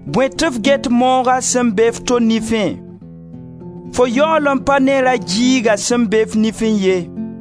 Bõe tɩ f get mooga sẽn be f to nifẽ? Fo yaool n ka ne ra-giiga sẽn be f nifẽ ye.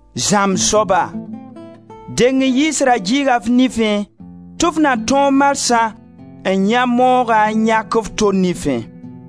Zãmb soaba, deng n yiis ra-giiga f nifẽ tɩ f na tõog marsã n yãe moogã n yãk f to nifẽ.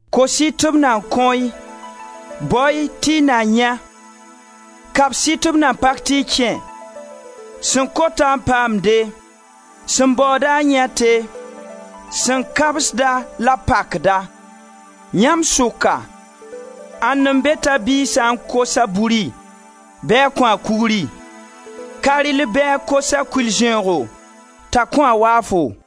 Kos-y tɩ b na kõ-y, bao-y tɩ y na yãe. Kabs-y tɩ b na pak tɩ y kẽ. Sẽn kota n paamde, sẽn baooda n yãete, sẽn kabsda la b pakda. Yãmb sʋka ãnd n be t'a biig sã n kos-a buri bɩ a kõ-a kugri? Ka rɩll bɩ a kos-a kʋɩl-zẽoogo t'a kõ-a waafo?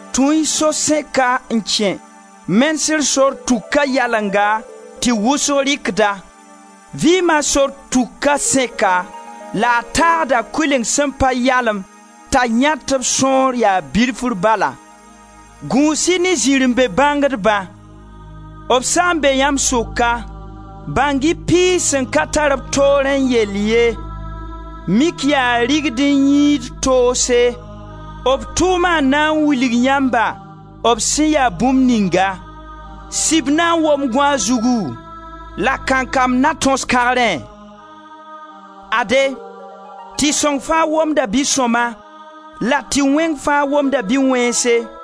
Tũ-y so sẽka n kẽ. Menesg sor tuka yalenga, tɩ wʋsg rɩkd-a. Vɩɩma sor tuka sẽka la a tãagda kʋɩleng sẽn pa yalem t'a yãetb sõor ya bilfri bala. Gũus-y ne zirẽ-be-bãngdba. B sã n be yãmb sʋka, bãng-y piis sẽn ka tar b toorẽ yell ye, mik yaa digd-n-yĩid-toose. B tʋʋma n na n wilg yãmba b sẽn ya bũmb ninga. Sib na wob gõaag zugu? La kankam na tõs kãgrẽ? Ade, tɩ-sõng faa womda bi-sõma la tɩ-wẽng fãa womda bi-wẽnse.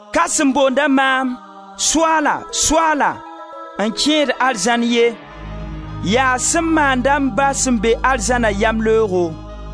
Ka sẽn boond-a maam: ‹Soaala, Soaala,› n kẽed arzãn ye, yaa sẽn maand-a m Ba sẽn be arzãna yamleoogo.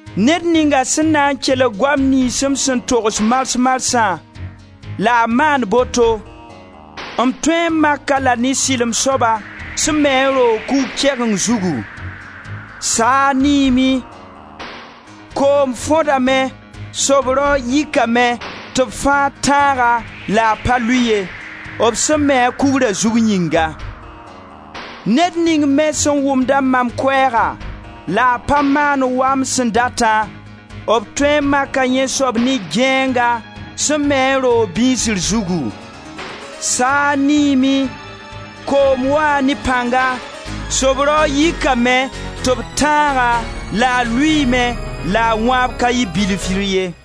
Ned ninga sẽn na n kelg goam niyns m sẽn togs mars marsã la a maand boto, m tõe n mak-a la ne sɩlem soaba sẽn me a roog kugr kegemd zugu. Saag niime, koom fõdame, sob-raoog yikame tɩ b fãa tãag-a la a pa lʋɩ ye, b sẽn me-a kugra zug yĩnga. Ned ning me sẽn wʋmd-a mam koɛɛga la a pa maand wa m sẽn datã, b tõe n maka yẽ soab ne gãeenga sẽn me a roog bĩsr zugu. Saag niime, koom waa ne pãnga, sob-raoog yikame tɩ b tãag-a la a lʋɩɩme la a wãab ka yɩ bilfr ye!»